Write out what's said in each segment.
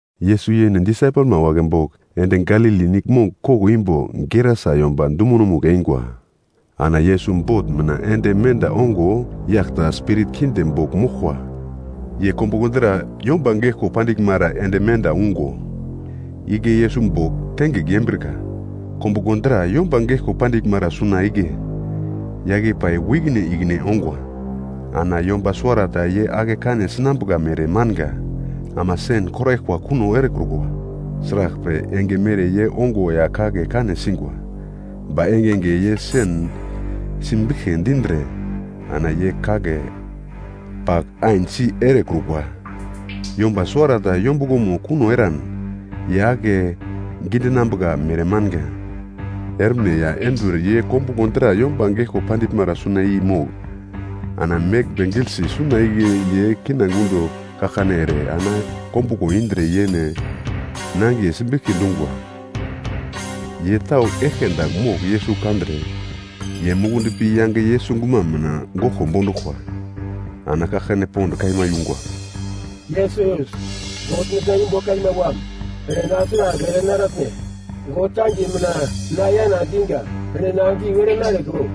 Yesus yene disaipelma wagle bogl ende Galili Niglmong koglo imbo Gerasa yomba dumonomugl eingwa. Ana Yesus bot mina ende menda ongo, yagl ta spirit kinde bogl moglkwa, ye kombuglo dra yomba geglko pandiglmara ende menda ungo, igle Yesus bogl tengigl yembrika. Kombuglo dra yomba geglko pandiglmara suna igle, yagl i pai wu ikine ikine ongwa, ana yomba suwarata ye ake kane sinambuka mere manga, ama sen koraglkwa kuno erekrukwa. Sraglpre enge mere ye ongo ya kagle kane singwa. Ba engenge ye sen simbiglki dindre ana ye kagle pagl ain si erekrukwa. Yomba suwarata yombuglomo kuno eran ye ake gidinambuka mere manga. Etne ya enduwer ye kombuglo dra yomba geglko pandiglmara suna i mogl ana meglmbe giglte suna igle ye kina gundo kaglkane ere, ana kombuglo indre yene nangiye simbiglki dungwa. Ye tau eglke dagl mogl Yesus kandre, ye mukundi pi yange Yesus guma mina goglko bonduglkwa. Ana kaglkane pond kaima yungwa, “Yesus, God mitna imbo kaima Wam! Ene na sragl ere naratne? God kangiye mina na yana diga, ene na giu ere narekro!”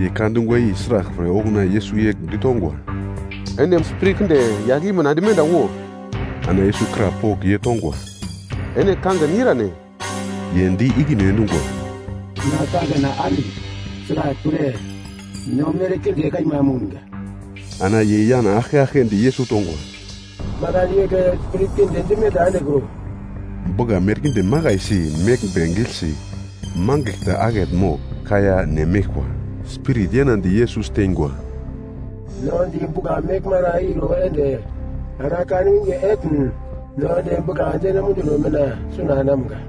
Ye ka dungwa i sraglpre, okuna Yesus yegl ditongwa, “Ene spirit kinde, yagl i mina ende menda wo!” Ana Yesus krapogl ye tongwa, “Ene kangin irane?” Ye di ikine endungwa, “Na kangina Ami, sraglpre no merkinde kaima mounga!” Ana ye yana aglke aglke di Yesus tongwa, “Makan igle spirit kinde dimenda endekro.” Bugla merkinde makaisi meglmbe giglte mangigl ta akete mogl kaiya ne meglkwa. Spirit yanadi Yesus teingwa, “No di bugla meglmara iro ende ana kan winge etn no ende bugla deno munduno mina suna enamga.”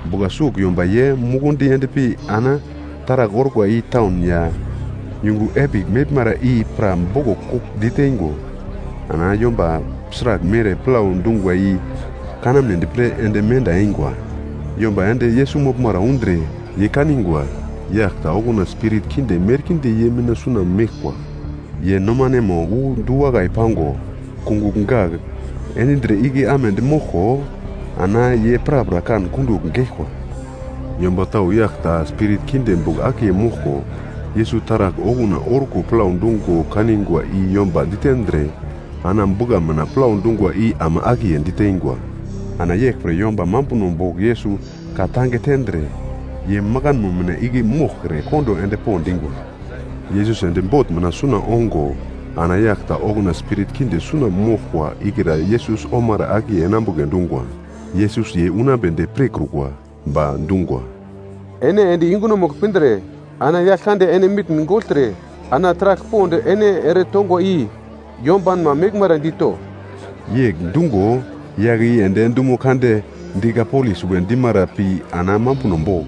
Bugla sugl yomba ye mukundi endpi ana taragl orkwa i taun ya yungu epigl meglmara i pra boglo kugl diteingo ana yomba sragl mere plau dungwa i kanamnedi pre ende menda eingwa. Yomba ende Yesus moglmara undre ye kanigwa yagl ta okuna spirit kinde merkinde ye mina suna meglkwa. Ye nomanemo wu du-wakai pango, kungugl gagl endindre igle amedi moglko ana ye prapra kan kundugl geglkwa. Yomba tau yagl ta spirit kinde bogl akiye moglko, Yesus taragl okuna orko plau dungo kanigwa i yomba ditendre ana bugla mina plau dungwa i ama akiye diteingwa. Ana yeglpre yomba mambuno bogl Yesus ka-tange tendre ye makano mina igle moglkre kondo endpo dingwa. Yesus ende bot mina suna ongo ana yagl ta okuna spirit kinde suna moglkwa ikra Yesus omara akiye enambugle dungwa. Yesus ye unambedi pirkrukwa, ba dungwa, “Ene ende yungunomugl pindre ana Yaglkande ene mitn gogltre ana taragl pond ene ere tongwa i yombanma meglmara dito.” Yegl dungo yagle i ende dumo kande Dikapolis we dimara pi ana mambuno bogl,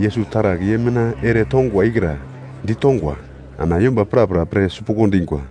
Yesus taragl ye mina ere tongwa ikra ditongwa. Ana yomba prapra pir sipuglo dingwa.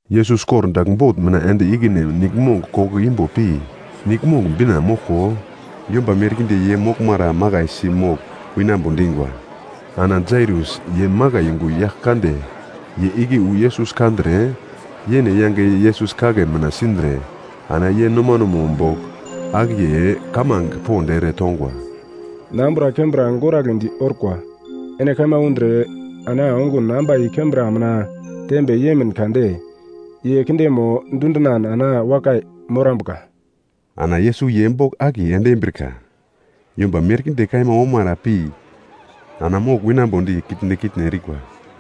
Yesus kordagl bot mina ende ikine niglmong koglo imbo pi niglmong bina moglko, yomba merkinde ye moglmara makaisi mogl winambo dingwa. Ana Jairus, ye makai yungu yagl kande, ye igle wu Yesus kandre, yene yange Yesus kagle mina sindre ana ye nomanemo bogl akiye kamange pond ere tongwa, “Na ambura kembra goragledi orkwa. Ene kaima undre ana ongun ambai kembra mina tembe yemin kade ye kindemo dundinan ana wakai morambuka.” Ana Yesus ye bogl akiye ende embrika. Yomba merkinde kaima omara pi ana mogl winambodi kitne kitne erikwa.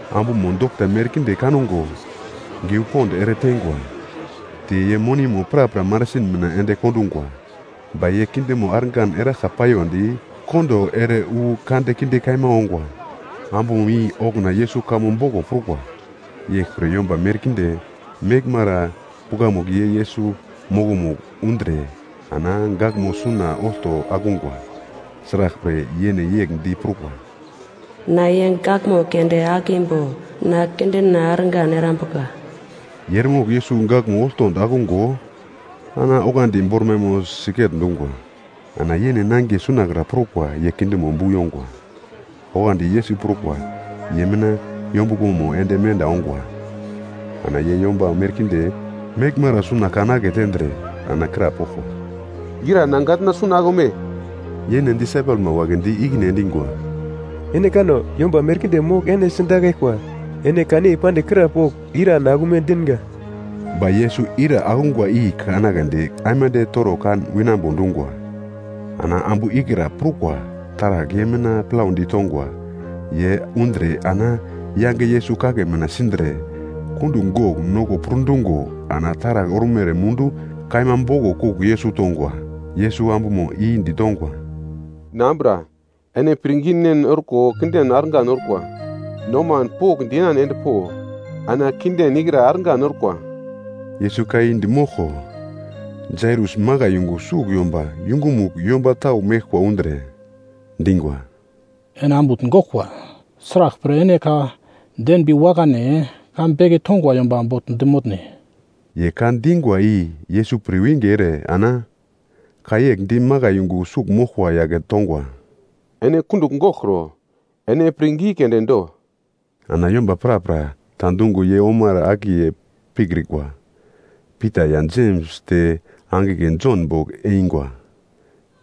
Ambumo dokta merkinde kango geu pond ere teingwa, te ye monimo prapra marasin mina ende kondungwa. Ba ye kindemo argan eragla paiyondi, kondo ere wu kandekinde kaima ongwa. Ambumo i okuna Yesus kamo boglo prukwa. Yeglpre yomba merkinde meglmara pukamugl ye Yesus mokomugl undre ana gaglmo suna olto akungwa. Sraglpre, yene yegl di prukwa, “Na ye gaglmo keunde akimbo na kindena argan erambuka.” Ye eremogl Yesus gaglmo olto akungo ana oglandi bormaimo siget-dungwa. Ana yene nangiye sunakra prukwa ye kindemo bu yongwa. Oglandi Yesus prukwa ye mina yombuglomo ende menda ongwa. Ana ye yomba merkinde meglmara suna kan aketendre, ana krapoglkwa, “Ira na gatna suna akume?” Yene disaipelma wagle di ikine endingwa, “Ene kano, yomba merkinde mogl ene sidakaglkwa. Ene kan yei pandigl krapogl, ‘Ira na akume dinga?’” Ba Yesus ira akungwa i kanagledi aimande toro kan winambo dungwa. Ana ambu ikra prukwa taragl ye mina plaudi tongwa, ye undre ana yange Yesus kagle mina sindre, kundugl gogl noko purdungo, ana taragl ormere mundu kaima boglo kugl Yesus tongwa. Yesus ambumo i ditongwa, “Na ambura, ene pirnginen orko kinden argan orkwa. Noman pokndi yenan endpo, ana kinden ikra argan orkwa.” Yesus ka i di moglko, Jairus makai yungu sugl yomba yungumugl yomba tau meglkwa undre, dingwa, “Ene ambutn goglkwa. Sraglpre ene ka denbi wakane ka beke tongwa yomba bogl di motne?” Ye ka dingwa i Yesus pirwinge ere ana ka yegl di makai yungu sugl moglkwa yagle tongwa, “Ene kundugl goglkro, ene pirngi keunde do.” Ana yomba prapra ta dungo ye omara akiye pikrikwa, Pita ya Jems te angigle Jon bogl eingwa.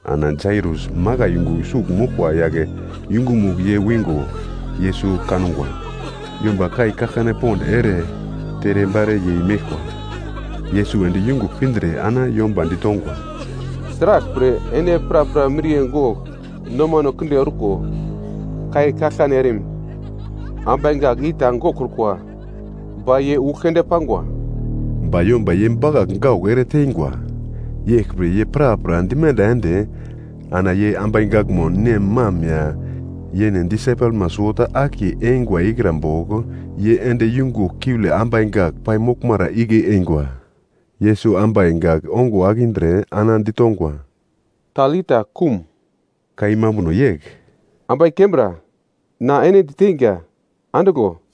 Ana Jairus makai yungu sugl moglkwa yagle yungumugl ye wingo, Yesus kangwa, yomba kai kaglkane pond ere terebare yei meglkwa. Yesus ende yungugl pindre ana yomba ditongwa, “Sraglpre ene prapra miriye gogl nomano kinde orko, kai kaglkane erim? Ambai gak i ta goglkrukwa, ba ye ugl keunde pangwa.” Ba yomba ye bakagl gaugl ere teingwa. Yeglpre ye prapra dimenda ende ana ye ambai gakmo nem mam ya, yene disaipelma suwota akiye eingwa ikra bogl ye ende yungugl kiule ambai gak pai moglmara igle eingwa. Yesus ambai gak ongo akindre ana ditongwa, “Talitha, koum!” (Ka i mambuno yegl, “Ambai kembra, na ene diteinga, andiglo!”)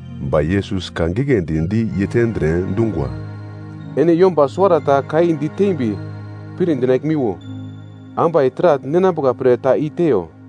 Ba Yesus ka giglendi di ye tendre, dungwa, “Ene yomba suwarata ka i ditembi pir dinaglmiwo, ambai taragl ninambuka pre ta i teiyo.”